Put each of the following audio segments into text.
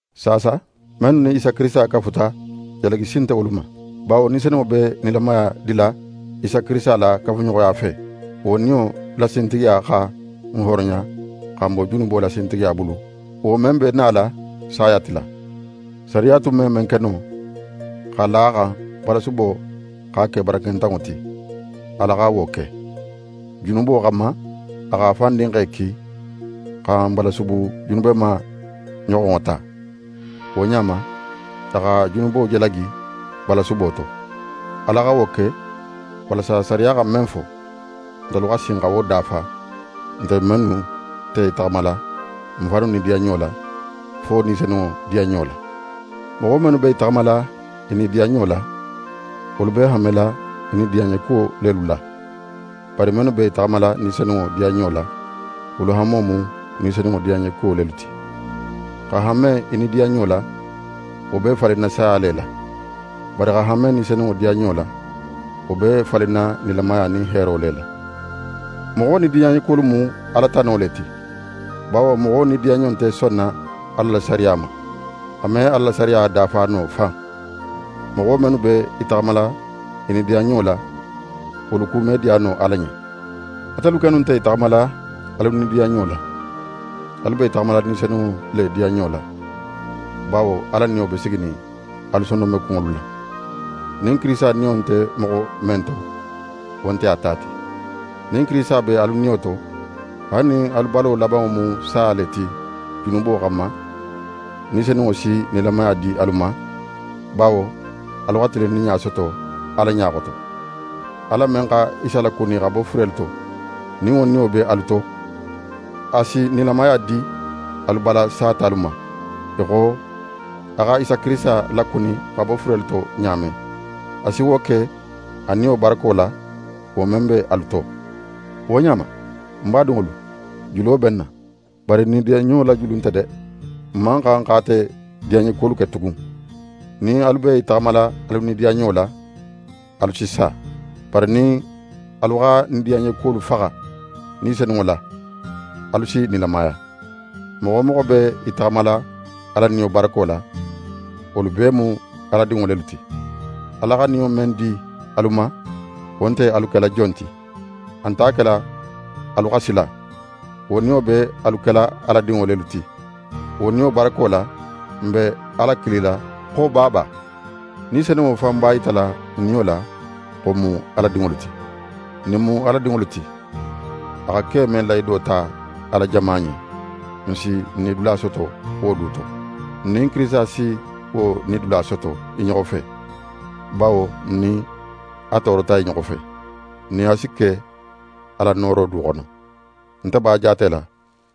Saasa, mennu nin Isa Kirisita kafuta, jalagi si nte wolu ma. Bawo Ni Senunŋo men be nilamaya dila Isa Kirisita la kafuɲoxoya fe, wo Niyo la sintigiya xa ń hooroya xa ń bo junubo la sintigiya bulu, wo men be nala saya tila. Sariya tun me men ke no, x'a la a xan balasubo x'a ke barakentanŋo ti, Ala xa wo ke: Junubo xanma, a x'a fan Dinxe ki xa n balasubu junubema ɲoxonŋo ta. Wo ɲa ma, a xa junubo jalagi balasubo to. Ala xa wo ke, walasa sariya xa men fo, ntelu xa sin xa wo dafa, ntelu mennu nte i taxamala n fannu nidiyanɲo la, fo Ni Senunŋo diyanɲo la. Moxo mennu be i taxamala i nidiyanɲo la, wolu be hanmela i nidiyanɲekuwo lelu la; bari mennu be i taxamala Ni Senunŋo diyanɲo la, wolu hanmo mu Ni Senunŋo diyanɲekuwo lelu ti. Xa hanme í nidiyanɲo la, wo be falinna saya le la. Bari xa hanme Ni Senunŋo diyanɲo la, wo be falinna nilamaya nin heero le la. Moxo nidiyanɲekuwolu mu Ala tano le ti; bawo moxo nidiyanɲo nte sonna Ala la sariya ma. A me Ala la sariya dafa no fan. Moxo mennu be i taxamala i nidiyanɲo la, wolu ku me diya no Ala ɲen. Atelu kennu nte i taxamala alu nidiyanɲo la; alu be i taxamala Ni Senunŋo le diyanɲo la, bawo Ala Niyo be siginin alu sondonmekunŋolu la. Nin Kirisita Niyo nte moxo men to, wo nte a ta ti. Nin Kirisita be alu niyo to, haali nin alu balo labanŋo mu saya le ti junubo xanma, Ni Senunŋo si nilamaya di alu ma, bawo alu xa tilinninɲa soto Ala ɲa xoto. Ala men xa Isa lakuni xa bo furelu to, nin wo Niyo be alu to, a si nilamaya di alu bala satalu ma, í xo a xa Isa Kirisita lakuni xa bo furelu to ɲa men. A si wo ke a Niyo barako la, wo men be alu to. Wo ɲa ma, ń badinŋolu, julo be n na. Bari n nidiyanɲo la julu nte de. N man xan x'ate diyanɲekuwolu ke tugun. Nin alu be i taxamala alu nidiyanɲo la, alu si sa. Bari nin alu xa nidiyanɲolu faxa Ni Senunŋo la, alu si nilamaya. Moxo wo moxo be í taxamala Ala Niyo barako la, wolu bee mu Ala dinŋo lelu ti. Ala xa Niyo men di alu ma, wo nte alu kela jon ti, a nt'a kela alu xa sila. Wo Niyo be alu kela Ala dinŋo lelu ti. Wo Niyo barako la, n be Ala kilila xo «Baaba!» Ni Senunŋo fan b'a yitala n niyo la xo n mu Ala dinŋolu ti. Nin n mu Ala dinŋolu ti, a xa ke men lahido ta a la jama ɲen, n si n nidula soto wo du to. N nin Kirisita si wo nidula soto i ɲoxo fe; bawo nin n nin a toorota i ɲoxo fe, n nin a si ke a la nooro du xono. Nte b'a jaatela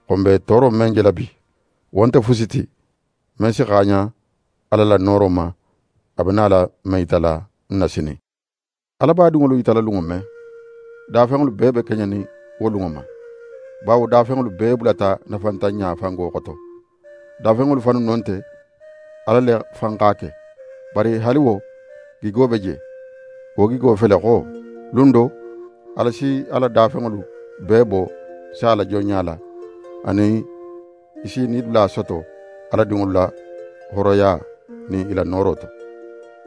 xo n be tooro men jela bi, wo nte fusi ti, men si xaaɲan Ala la nooro ma, a be nala men yitala n na sinin. Ala b'a dinŋolu yitala lunŋo men, dafenŋolu bee be keɲenin wo lunŋo ma. Bawo dafenŋolu bee bulata nafantanɲa fango xoto. Dafenŋolu fannu no nte, Ala le fan x'a ke. Bari haali wo, gigo be je. Wo gigo fele xo: Lun do, Ala si a la dafenŋolu bee bo saya la jonɲa la, anin i si i nidula soto Ala dinŋolu la hooroya nin i la nooro to.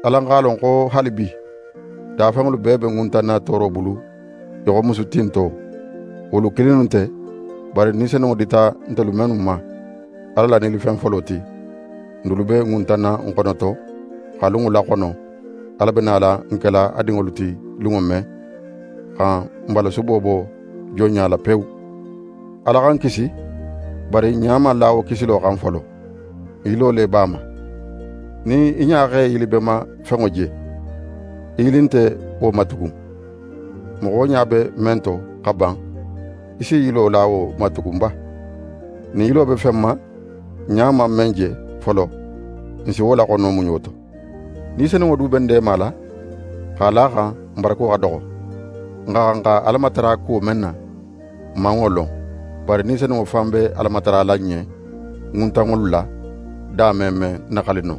Alan x'a lon xo haalibi, dafenŋolu bee be ŋuntanna tooro bulu, í xo musu tinto. Wolu kilinnu nte, bari Ni Senunŋo dita ntelu mennu ma Ala la nilifen folo ti, n dulu be ŋuntanna n xonoto, xa lunŋo laxono, Ala be nala n kela a dinŋolu ti lunŋo men, xa n balasubo bo jonɲa la pewu. Ala xa n kisi. Bari n ɲa man la wo kisilo xan folo, n yilo le b'a ma. Nin í ɲa x'é yilibenma fenŋo je, í yili nte wo ma tugun. Moxo ɲa be men to xa ban, í s'í yilo la wo ma tugun ba? Nin n yilo be fen ma, n ɲa man men je folo, n si wo laxono muɲo to. Ni Senunŋo du be n deemala x'a la a xan n barako xa doxo. N xa xan xa Ala matara kuwo men na, n man wo lon. Bari Ni Senunŋo fan be Ala matarala n ɲen ŋuntanŋolu la, da me men naxali no.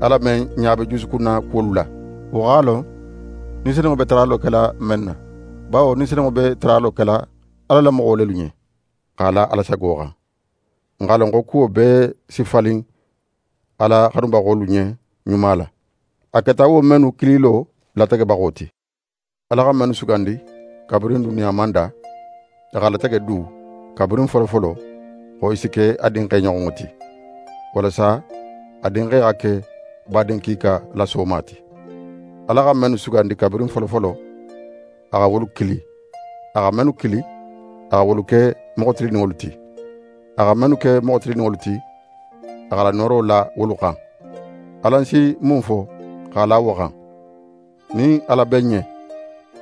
Ala men ɲa be jusukunna kuwolu la, wo x'a lon Ni Senunŋo be taralo kela men na, bawo Ni Senunŋo be taralo kela Ala la moxo lelu ɲen, x'a la Ala sago xan. N x'a lon xo kuwo bee si falin Ala xanubaxolu ɲen ɲuma la, a keta wo mennu kililo lategebaxo ti. Ala xa mennu sugandi kabirin duniya man da, a x'a latege du kabirin folofolo xo i si ke a Dinxe ɲoxonŋo ti, walasa a Dinxe xa ke badin kiika la sooma ti. Ala xa mennu sugandi kabirin folofolo, a xa wolu kili; a xa mennu kili, a xa wolu ke moxo tilinninŋolu ti. A xa mennu ke moxo tilinninŋolu ti, a x'a la nooro la wolu xan. Alan si mun fo x'a la wo xan? Nin Ala be n ɲen,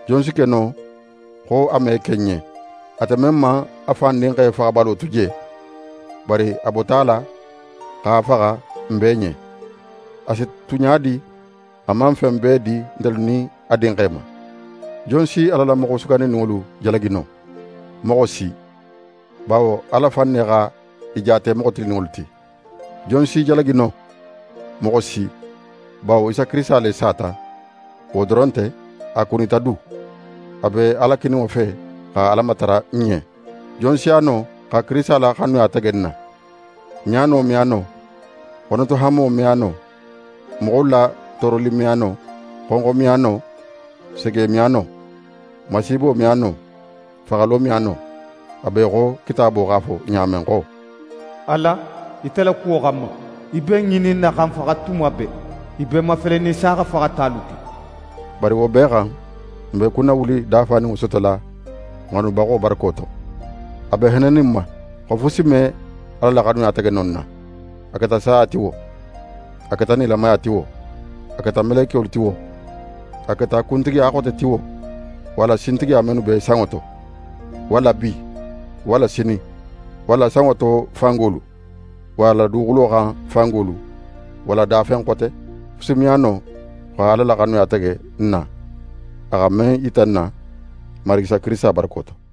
jon si ke no xo a me ke n ɲen? Ate men man a fan Dinxe faxabalo tu je, bari a bota a la a xa faxa n bee ɲen, a si tu ɲa di a man fen bee di ntelu nin a Dinxe ma? Jon si Ala la moxo sugandininŋolu jalagi no? Moxo si, bawo Ala fan ne xa i jaate moxo tilinninŋolu ti. Jon s'i jalagi no? Moxo si, bawo Isa Kirisita le sata. Wo doron nte, a kunita du, a be Ala kininŋo fe xa Ala matara n ɲen. Jon si a no xa Kirisita la xanuya tege n na? Ɲaano me a no, xonotohanmo me a no, moxolu la tooroli me a no, xonxo me a no, sege me a no, masiibo me a no, faxalo me a no. A be í xo Kitaabo x'a fo ɲa men xo: «Ala, ite la kuwo xanma, i be n ŋininna xa n faxa tuma bee. I be n mafelenin saaxa faxatalu ti.» Bari wo bee xan, n be kunnawuli dafaninŋo sotola n xanubaxo barako to. A be hennenin n ma xo fusi me Ala la xanuya tege no n na: A keta saya ti wo, a keta nilamaya ti wo, a keta melekiyolu ti wo, a keta kuntigiya xote ti wo, walla sintigiya mennu be sanŋo to, walla bi, walla sinin, walla sanŋo to fangolu, walla duguxulo xan fangolu, walla dafen xote, fusi me a no xa Ala la xanuya tege n na, a xa men yita n na n Marigi Isa Kirisita barako to.